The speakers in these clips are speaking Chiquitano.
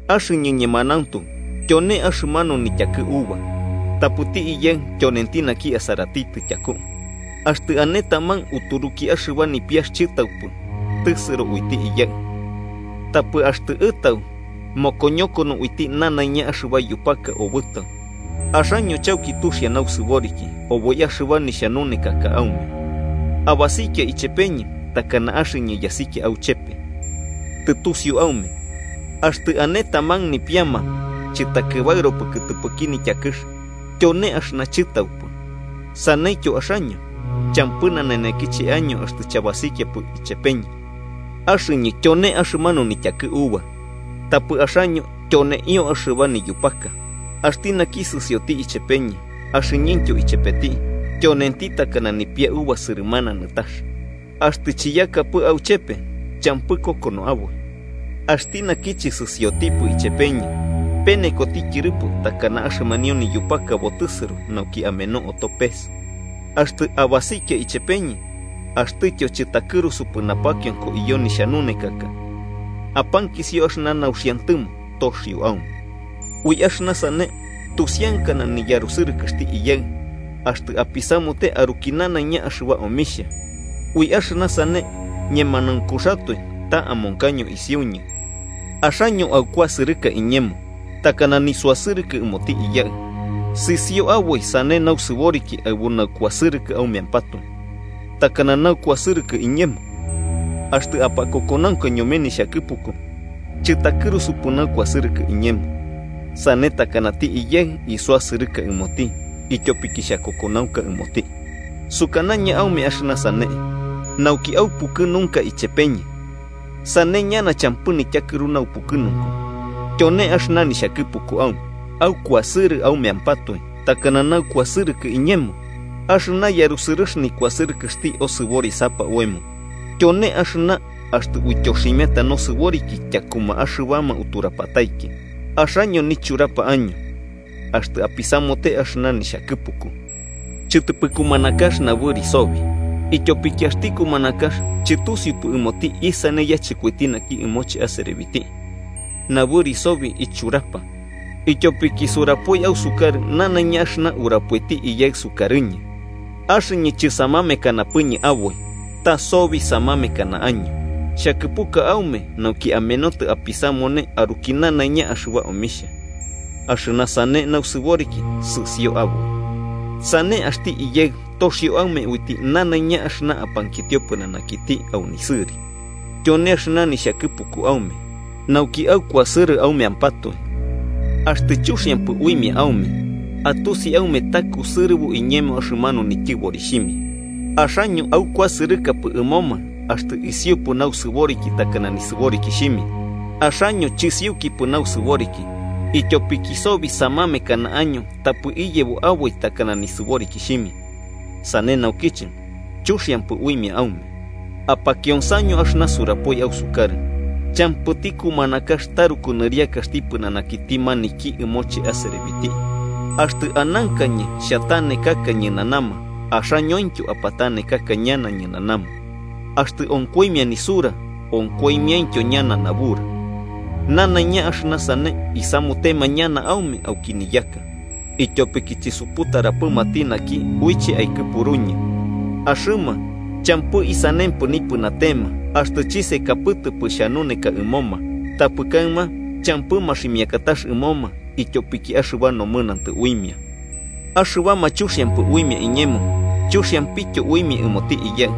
“Axɨñɨ ñemanauntu tyone axɨmanu nityakɨ uva, tapɨti Iyaɨ tyonenti naki asaratitɨ tyaku. Axtɨ ane taman uturuki axɨba nipiax chɨtaupɨ, tɨsɨro uiti Iyaɨ. Tapɨ axtɨ ɨtau, mokoñokono uiti nanaiña axɨba yupaka obɨtau. Axaño chauki tuxia nausɨboriki oboi axɨba nixhanunekaka aume. Abasikia ichepeñɨ takana axɨñɨ yasikia auchepe. Tɨtusiu aume axtɨ ane taman nipiama chɨtakɨbaɨropɨ kɨtɨpɨki nityakɨx tyone axɨna chɨtaupɨ. Saneityo axaño, champɨ nanenekiche año axtɨ chabasikiapɨ ichepeñɨ. Axɨñɨ tyone axɨmanu nityakɨ uva, tapɨ axaño tyoneio axɨba niyupaka. Axti naki sɨsioti ichepeñɨ, axɨñɨntyo ichepeti, tyonenti takana nipia uva sɨrɨmana nɨtax. Axtɨ chiyakapɨ auchepe champɨ kokonobo aboi. Axti naki chɨsɨsiotipɨ ichepeñɨ, penekoti tyɨrɨpo takana axɨmanio niyupaka botɨsɨro nauki ameno oto pes. “Axtɨ abasikia ichepeñɨ axtɨtyo chɨtakɨrusupɨ napakionko iyo nixhanunekaka, apankisio axɨna nauxiantɨmo toxio aume. Ui axɨna sane tusiankana niyarusɨrɨkɨxti Iyaɨ, axtɨ apisamute aruki nanaiña axɨba omixhia, ui axɨna sane ñemanaunkuxatoe ta amonkaño isiuñɨ. Axaño aukuasɨrɨka iñemo, takana nisuasɨrɨkɨ ɨmoti Iyaɨ. Sɨsio aboi sane nausɨboriki aɨbu naukuasɨrɨkɨ aumeampatoe, takana naukuasɨrɨkɨ iñemo. Axtɨ apakokonaunka ñome nixhakɨpuku, chɨtakɨrusupɨ naukuasɨrɨkɨ iñemo, sane takanati Iyaɨ isuasɨrɨka ɨmoti, ityopiki xhakokonaunka ɨmoti. “Sukanañɨ aume axɨna sane, nauki aupukɨnunka ichepeñɨ. Sane ñana champɨ nityakɨru naupukɨnunku. Tyone axɨna nixhakɨpuku aume: Aukuasɨrɨ aumeampatoe, takana naukuasɨrɨkɨ iñemo. Axɨna yarusɨrɨx nikuasɨrɨkɨxti osɨborisapa oemo, tyone axɨna axtɨ uityoximiata nosɨboriki tyakuma axɨbama uturapatiki. Axaño nichurapa año axtɨ apisamute axɨna nixhakɨpuku. Chɨtɨpɨ kumanakax nabɨri sobi, ityopiki axti kumanakax chɨtusiupɨ ɨmoti isane yachɨkoiti naki ɨmoche aserebiti. Nabɨri sobi ichurapa, ityopiki surapoi ausukarɨ nanaiña axɨna urapoiti Iyaɨ sukarɨñɨ. Axɨñɨ chɨsamamekanapɨñɨ aboi, ta sobi samamekana año. Xhakɨpuka aume nauki amenotɨ apisamune aruki nanaiña axɨba omixhia, axɨna sane nausɨboriki sɨsio aboi. Sane axti Iyaɨ toxio aume uiti nanaiña axɨna apankitio pɨnanakiti au nisɨri. Tyone axɨna nixhakɨpuku aume: Nauki aukuasɨrɨ aumeampatoe. “Axtɨ chuxiampɨ uimia aume, atusi aume ta kusɨrɨbo iñemo axɨmanu nityɨborixhimia. Axaño aukuasɨrɨkapɨ ɨmoma axtɨ isiupɨ nausɨboriki takana nisɨborikixhimia. Axaño chisiukipɨ nausɨboriki, ityopiki sobi samamekana año tapɨ iyebo aboi takana nisɨborikixhimia. Sane naukiche chuxiampɨ uimia aume. Apakionsaño axɨna surapoi ausukarɨ: ‘Champɨti kumanakax taruku nɨriakaxti pɨnanakiti maniki ɨmoche aserebiti.’ Axtɨ anankañɨ xhatanekaka ñɨnanama, axañointyo apatanekaka ñana ñɨnanama. Axtɨ onkoimia nisura, onkoimiaintyo ñana nabura. Nanaiña axɨna sane isamutema ñana aume auki niyaka, ityopiki chisuputarapɨmati naki uiche aikɨpuruñɨ. “Axɨma champɨ isanempɨ nipɨnatema, axtɨ chisekapɨtɨpɨ xhanuneka ɨmoma. Tapɨ kaɨma champɨ maximiakatax ɨmoma ityopiki axɨba nomɨnantɨ uimia. Axɨbama chuxiampɨ uimia iñemo, chuxiampityo uimia ɨmoti Iyaɨ.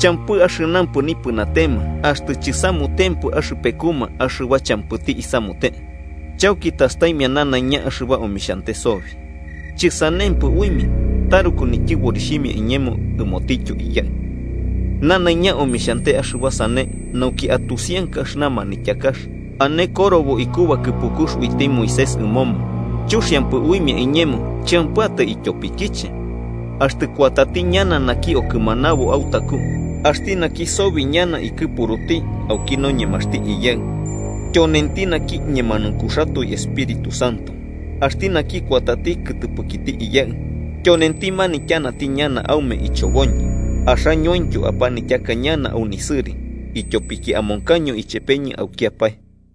Champɨ axɨnampɨ nipɨnatema, axtɨ chisamutempɨ axɨpekuma axɨba champɨti isamute. Chauki tastaimia nanaiña axɨba omixhante sobi. Chɨsanempɨ uimia taruku nityɨborixhimia iñemo ɨmotityo Iyaɨ. Nanaiña omixhante axɨba sane nauki atusianka axɨna manityakax ane korobo iku bakɨpukux uiti Moisés ɨmoma: ‘Chuxiampɨ uimia iñemo champɨatai ityopikiche.’ “Axtɨ kuatati ñana naki Okɨmanabo autaku axti naki sobi ñana ikɨpuruti auki noñemaxti Iyaɨ, tyonenti naki ñemanaunkuxatoe Espíritu Santo axti naki kuatati kɨtɨpɨkiti Iyaɨ, tyonenti manityanati ñana aume ichoboñɨ. Axañointyo apanityaka ñana au nisɨri, ityopiki amonkaño ichepeñɨ aukiapae.